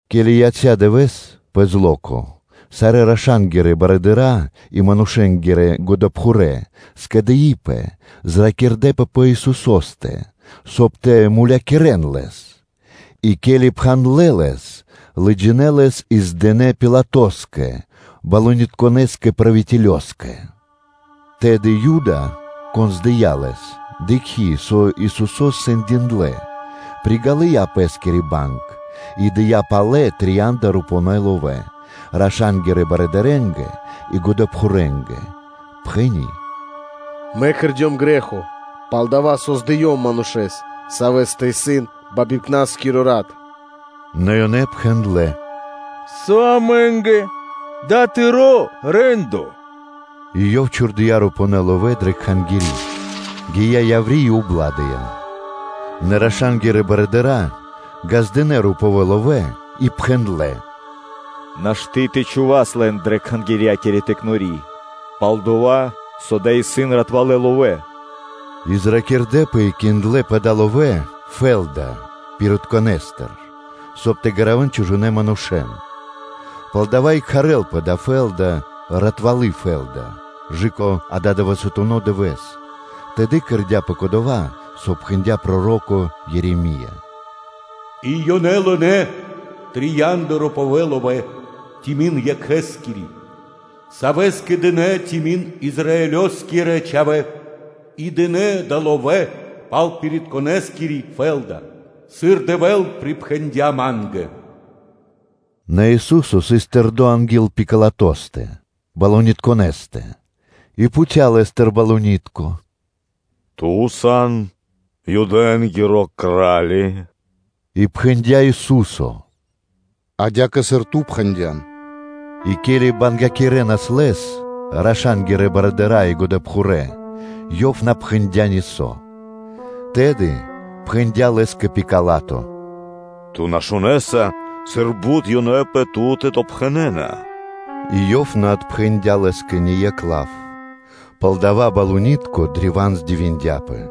Ке́ли яця́ дывэ́с, пэ зло́ко, сарэ́ раша́нгирэ барыдыра́ и тхэмэ́скирэ годэпхурэ́, зракирдэпэ пэ Исусо́стэ, соб (кай) тэ мулякирэ́н Лэс; И, ке́ли пхандлэ Лэс, лыджинэ́ Лэс и здынэ Пилатоскэ, тхэмэ́скирэ барыдырэскирэскэ (правителёскэ). Тэды Юда, кон здыя Лэс, дыкхи́, со Исусо́с сэндиндлэ, приґалыя пэ́скири банг и дыя́ палэ трия́нда рупувэ́ ловэ́ раша́нгирэ барыдырэ́нгэ и годэпхурэнгэ, пхэни́: “Мэ кэрдём грэ́хо, пал-дова́ со здыём Манушэ́с, Савэ́стэ исын бибангипнаскиро рат.” Нэ ёнэ пхэндлэ́: “Со амэ́нгэ? Дава́ исын тыро́ рэ́ндо.” И ёв чхурдыя́ рупувэ́ ловэ́ дрэ Кхангири́, гия́ яври́ и убладыя. Нэ раша́нгирэ барыдыра́ ґаздынэ́ рупувэ́ ловэ́ и пхэндлэ́ “Нашты́ тэ чхувас лэн дрэ Кхангирья́кири пиралы́ (тыкнори), пал-дова́ со дава́ исын ратвалэ́ ловэ́.” И зракирдэпэ и киндлэ пэ далэ́ ловэ́ фэ́лда пиритконэстыр (горшэчникостыр), соб (кай) тэ гаравэн чужонэ́ манушэ́н. Палдова́ и кхарлапэ дая́ фэ́лда ‘Ратвалы фэ́лда’ кэ ададывэсатуно дывэ́с. Тэды кэрдя́пэ кодова́, со пхэндя́ проро́ко Ереме́ё: “И ёнэ лынэ́ трия́нда рупувэ́ ловэ́, тими́н Екхэскири, Савэ́скэ дынэ́ тими́н Израилёскирэ чхавэ́, и дынэ́ далэ́ ловэ́ пал пиритконэскири фэ́лда, сыр Дэвэ́л припхэндя́ Ма́нгэ.” Нэ Ису́со сыс тэрдо́ анги́л Пилатостэ, тхэмэ́скирэ барыдырэстэ; и пхуця́ Лэ́стыр: “Ту сан Юдэ́нгиро Кра́ли?” И пхэндя́ Ису́со: “Адя́кэ, сыр ту пхэндя́н.” И ке́ли бангякирэнас Лэс раша́нгирэ барыдыра́ и годэпхурэ́, Ёв на пхэндя́ нисо́. Тэды пхэндя́ Лэ́скэ Пила́то: “Ту на шунэса, сыр бут ёнэ пэ Ту́тэ допхэнэна?” И Ёв на отпхэндя́ Лэ́скэ ни екх лав, палдава́ тхэмэскиро барыдыро́ древа́н здивиндяпэ.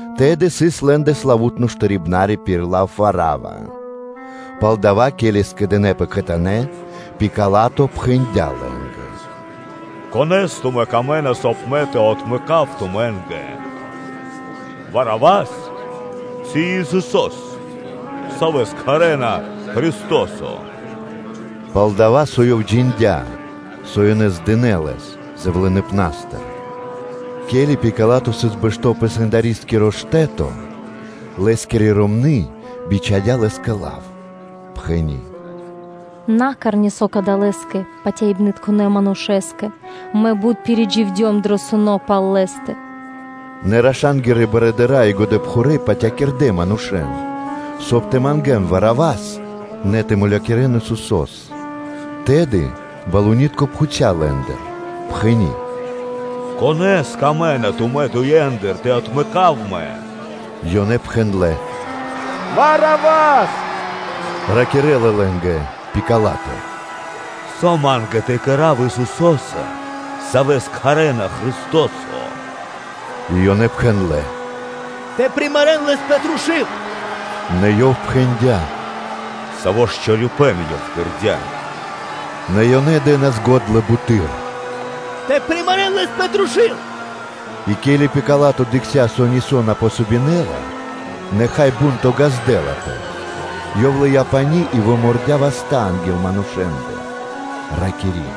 Тэды сыс лэ́ндэ славу́тно штарибнари пир лав Варава. Палдава́, ке́ли скэдынэ́пэ кхэтанэ́, Пила́то пхэндя́ лэ́нгэ: “Конэ́с тумэ́ камэ́на, соб (кай) мэ тэ отмэкав тумэ́нгэ: Варавас ци Исусо́с, савэ́с кхарна Христо́со?” Пал-дова́ со ёв джиндя́, со ёнэ здынэ Лэс зэвлыныпнастыр. Ке́ли Пила́то сыс бэшто́ пэ сэндарискиро штэ́то, лэ́скири ромны́ бичхадя́ лэ́скэ лав, пхэни́: “На кэр нисо́ Кадалэскэ Патяибнытконэ Манушэ́скэ; мэ бут пиридживдём дро суно́ (сунэ́) пал Лэ́стэ.” Нэ раша́нгирэ барыдыра́ и годэпхурэ́ патякирдэ манушэ́н, соб (кай) тэ мангэ́н Варавас, нэ тэ мулякирэ́н Исусо́с. Тэды барыдыро́ пхуця́ лэ́ндыр, пхэни́: “Конэ́с камэ́на тумэ́ дуендыр тэ отмэкав мэ?” Ёнэ пхэндлэ́: “Варавас.” Ракирэ́ла лэ́нгэ Пила́то: “Со ма́нгэ то кэра́в Исусо́са, Савэс кхарэ́на Христо́со?” И ёнэ пхэндлэ́: “Тэ примарэн Лэс пэ трушу́л.” Нэ ёв пхэндя́: “Саво́ ж чорипэ́н Ёв кэрдя́?” Нэ ёнэ дэ́нас го́дла буты́р: “Тэ примарэн Лэс пэ трушу́л!” И ке́ли Пила́то дыкхця́, со нисо́ на помогинэла, нэ, хай, шумо годлэнца кэ бу́нто ґаздэ́лапэ, ёв лыя́ пани́ и вымордя васта́ анги́л манушэ́ндэ, ракири́: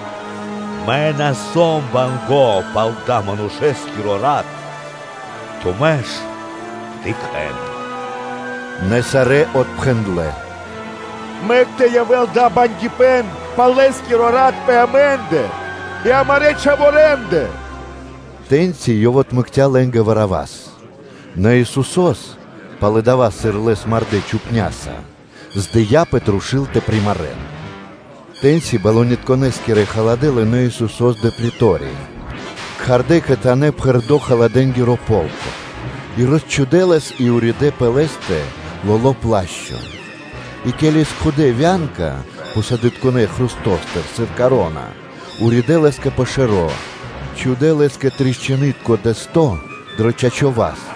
“Мэ на сом банго́ пал адалэ́ Манушэ́скиро рат, тумэ́ ж дыкхэ́н!” Нэ сарэ́ отпхэндлэ́: “Мэк тэ явэ́л дава́ бангипэн пал Лэ́скиро рат пэ амэ́ндэ и амарэ́ чхаворэндэ!” Тэ́ньци ёв отмэкця́ лэ́нгэ Варавас, нэ Исусо́с пало́ дова́, сыр Лэс мардэ́ чупняса, здыя пэ трушу́л тэ примарэн. Тэ́ньци тхэмэ́скирэ-барыдырэскирэ халадэ́ лынэ́ Исусо́с дрэ претория, кхардэ́ кхэтанэ́ пхэрдо́ халадэ́нгиро полко, и росчхудэ Лэс и уридэ́ пэ Лэ́стэ тёмнонэ-лоло́ плашчо, и ке́ли скхудэ вя́нка пхусадытконэ хрустостыр сыр коро́на, уридэ́ Лэ́скэ пэ шэро́, чхудэ́ Лэ́скэ тришчынытко дэсто́ дро чачо́ (право) васт,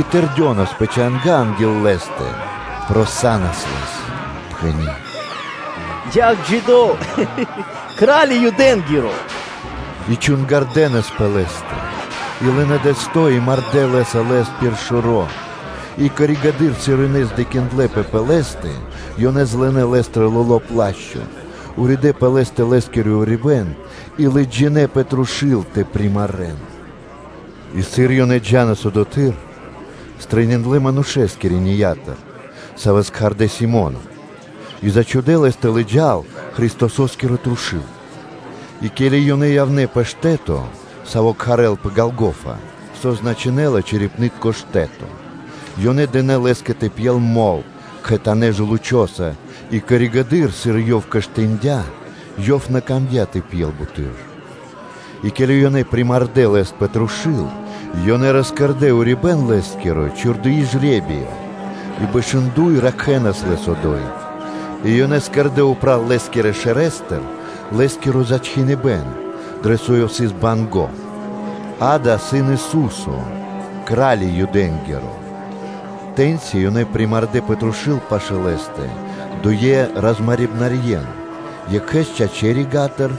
и тэрдёнас пэ чанга́ анги́л Лэ́стэ, просанас Лэс, пхэни́: “Яв джидо́, Кра́ли Юдэ́нгиро!” И чунгардэнас пэ Лэ́стэ, и лынэ́ дэсто́ и мардэ́ лэ́са Лэс пир шэро́. И коригэды́р (позжэды́р), сыр ёнэ сандлэпэ холямэс (здекиндлэпэ пэ Лэ́стэ), ёнэ злынэ Лэ́стыр лоло́ плашчо, уридэ́ пэ Лэ́стэ Лэ́скиро урибэ́н, и лыджинэ́ пэ трушу́л тэ примарэн. И сыр ёнэ джа́нас, одотхы́р стрэниндлэ манушэ́с Киринеятыр, савэ́с кхардэ́ Си́моно; и зачхудэ лэс тэ лыджа́л Христосо́скиро трушу́л. И ке́ли ёнэ явнэ́ пэ штэ́то, саво́ кхарлапэ ‘Ѓолгофа’, со значынэ́ла: ‘Чэрепнытко штэ́то,’ ёнэ дынэ́ Лэ́скэ тэ пьел мол (вино) кхэтанэ́ жэлучоса и коригэды́р, сыр Ёв коштындя, Ёв на камдя́ тэ пьел буты́р. И ке́ли ёнэ примардэ Лэс пэ трушу́л, ёнэ роскэрдэ урибэ́н Лэ́скиро, чхурдыи жре́биё, И бэшындой, ракхэнас Лэс одо́й. И ёнэ кэрдэ́ упра́л Лэ́скирэ шэрэстыр Лэ́скиро зачхиныбэн, дро со Ёв сыс банго́: “Дава́ исын Ису́со, Кра́ли Юдэ́нгиро.” Тэ́ньци ёнэ примардэ пэ трушу́л пашы́л Лэ́стэ дуе розмарибнарьен: екхэ́с чачэ́ рига́тыр,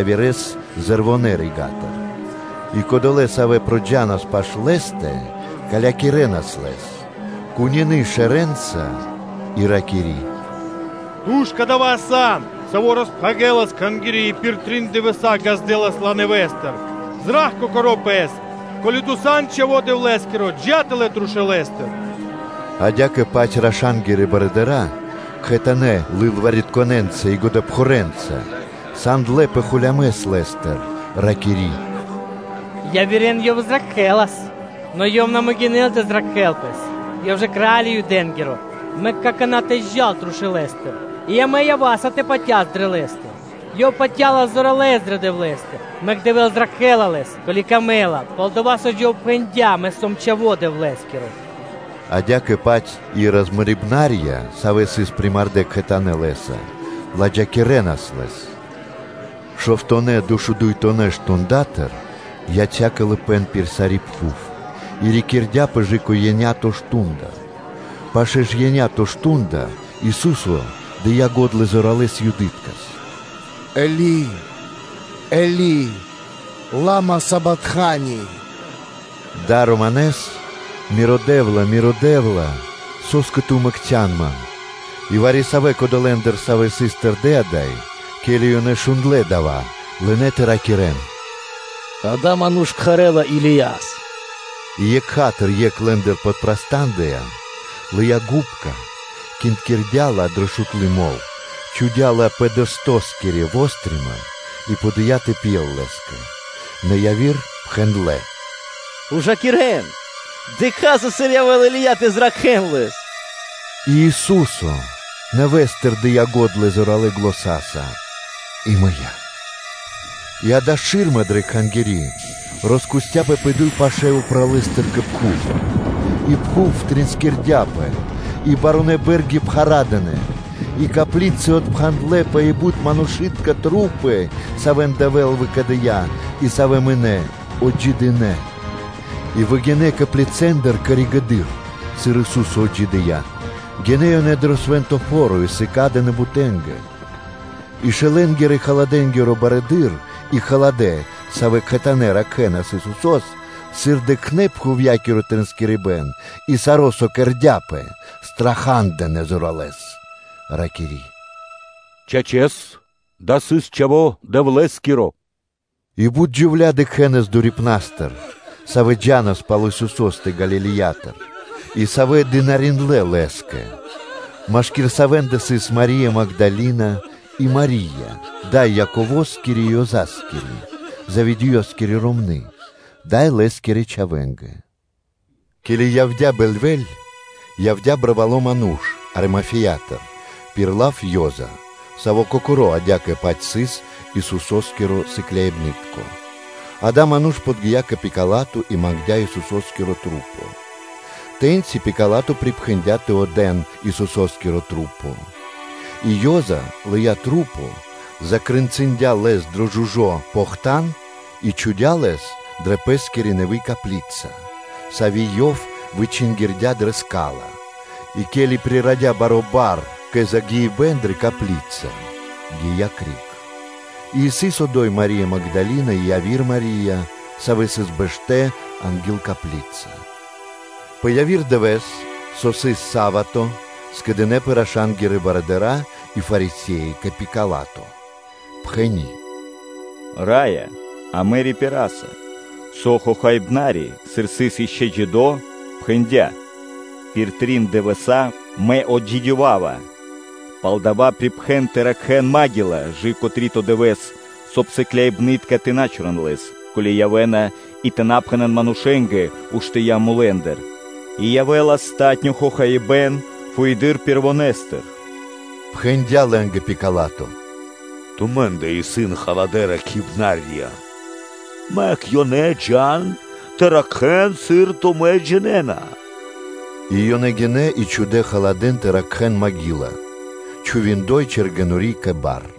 явирэ́с зэрвонэ (левонэ) рига́тыр. И кодолэ́, савэ́ проджанас пашы́л Лэ́стэ, калякирэнас Лэс, кунины шэрэнца; и ракири́: “Ту ж кадава́ сан, Саво́ роспхагирэлас Кхангири́ и пир трин дывэса́ ґаздэсас ла нэвэ́стыр. Зра́кх Кокоро́ Пэс. Ко́ли Ту сан Чхаво́ Дэвлэ́скиро, джа́ тэлэ́ трушулэстыр.” Адя́кэ-паць раша́нгирэ барыдыра́, кхэтанэ́ лылваритконэнца и годэпхурэнца сандлэпэ холямэс Лэ́стыр, ракири́: “Явирэ́н Ёв зракхэлас; нэ Ёв на могинэ́ла тэ зракхэ́л Пэс, Ёв ж кра́ли Юдэ́нгиро: мэк какана́ тэ джал трушулэстыр, и амэ ява́са тэ патяс дрэ Лэ́стэ. Ёв патя́ла зоралэ́с дрэ Дэвлэ́стэ, мэк Дэвэ́л зракхэ́ла Лэс, ко́ли камэ́ла. Пал-дова́ со Ёв жа пхэндя́: ‘Мэ сом Чхаво́ Дэвлэ́скиро.’” Адя́кэ-паць и розмарибнарья, савэ́ сыс примардэ кхэтанэ́ Лэ́са, ладжакирэнас Лэс. Шовтонэ (дэшудуйтонэ) мардэстыр (штундатыр) яця́ калыпэ́н пир сари́ пхув и рикирдяпэ кэ/жы́ко еня́то (биекхэ́скиро дэ́што) мардо́; пашэ́ ж еня́то (биекхэ́скиро дэ́што) мардо́ Ису́со дыя́ го́дла зоралэ́с Юдыткэс: “Эли, Эли, лама сабактхани?” Дава́ исын Романэс: ‘Миро Дэ́вла, Миро Дэ́вла, со́скэ Ту мэкцян Ман?’ И вари-савэ́ кодолэндыр, савэ́ сыс тэрдэ́ ада́й, ке́ли ёнэ шундлэ́ дава́, лынэ́ тэ ракирэ́н: “Адава́ ману́ш кхарэ́ла Илияс.” И екха́тыр екх лэ́ндыр подпрастандыя, лыя́ губка, киндькирдя ла дро шутлы мол, чхудя́ ла пэ дэстоскири (каштэскири) вострима, и подыя тэ пьел Лэ́скэ. Нэ яви́р пхэндлэ́: “Ужакирэн! Дыкхаса, сыр явэ́ла Или́я тэ зракхэ́л Лэс.” И Ису́со нэвэ́стыр дыя́ го́дла зоралэ́ заня́са и мыя́. И, акэ, шы́рма дрэ Кхангири́ роскусцяпэ пэ дуй паша́, упралэстыр кэ пхув; и пхув триинскирдяпэ, и барунэ́ бэ́рги пхарадынэ; и коплицы отпхандлэпэ, и бут манушы́тка тру́пы, савэ́н Дэвэ́л выкэдыя́ и савэ́ мынэ́, отджидынэ, и выгинэ́ коплицэндыр коригэды́р (позжэды́р), сыр Ису́со отджидыя́, гинэ́ ёнэ дро свэ́нто фо́ро и сыкадынэ бутэнгэ. И шэлэнгирэ-халадэ́нгиро барыдыро́ и халадэ́, савэ́ кхэтанэ́ ракхэнас Исусо́с, сыр дыкхнэ́ пхувья́киро триинскрибэн и саро́, со кэрдя́пэ, страха́дынэ зоралэ́с, ракири́: “Чачэс, дава́ сыс Чхаво́ Дэвлэ́скиро.” И бут джувля́ дыкхэнас дурипнастыр, савэ́ джа́нас пал Исусо́стэ Галилеятыр, и савэ́ дынариндлэ́ (служындлэ) Лэ́скэ, машки́р савэ́ндэ сыс Мари́я Магдалина, и Мари́я, дай Яковоскири и Ёзаскири, Заведеёскири ромны́, дай лэ́скирэ чхавэ́нгэ. Ке́ли явдя́ бэльвэ́ль, явдя́ барвало́ ману́ш Аримафеятыр пир лав Ёза (Иосифо), саво́ кокоро́ адя́кэ-паць сыс Исусо́скиро сыкляибны́тко. Адава́ ману́ш подги́я кэ Пила́то и мангдя́ Исусо́скиро тру́по. Тэ́ньци Пила́то припхэндя́ тэ отдэ́н Исусо́скиро тру́по. И Ёза лыя́ тру́по, закрэнцындя Лэс дро жужо́ (чысто) похтан, и чхудя́ Лэс дрэ пэ́скири нэви́ копли́ца, сави́ ёв вычингирдя дрэ ска́ла; и ке́ли прирадя баро́ бар кэ загиибэ́н дрэ копли́ца, гия́ криг. И сыс одо́й Мари́я Магдалина и яви́р Мари́я, савэ́ сыс бэштэ́ анги́л копли́ца. Пэ яви́р дывэ́с, саво́ сыс са́вато (субо́та), скэдынэ́пэ раша́нгирэ барыдыра́ и Фарисе́и кэ Пила́то, пхэни́: “Раё, амэ рипираса, со хохаибнари, сыр сыс ишчо (инкэ́) джидо́, пхэндя́: ‘Пир трин дывэса́ Мэ отджидёвава.’ Палдава́ припхэн тэ ракхэ́н магила кэ/жы́ко три́то дывэ́с, соб (кай) сыкляибны́тка тэ на чорэн Лэс, ко́ли явэ́на и тэ на пхэнэ́н манушэ́нгэ ‘уштыя́ мулэ́ндыр,’ и явэ́ла палатуно́ хохаибэ́н фуеды́р Пэрвонэстыр.” Пхэндя лэ́нгэ Пила́то: “Тумэ́ндэ исын халадэ́-ракхибна́рья: мэк ёнэ тэ джа́н, тэ ракхэ́н, сыр тумэ́ джинэ́на.” И ёнэ гинэ́, и чхудэ́ халадэ́н тэ ракхэ́н копли́ца, чхуви чэргэнори́ (печать) кэ бар.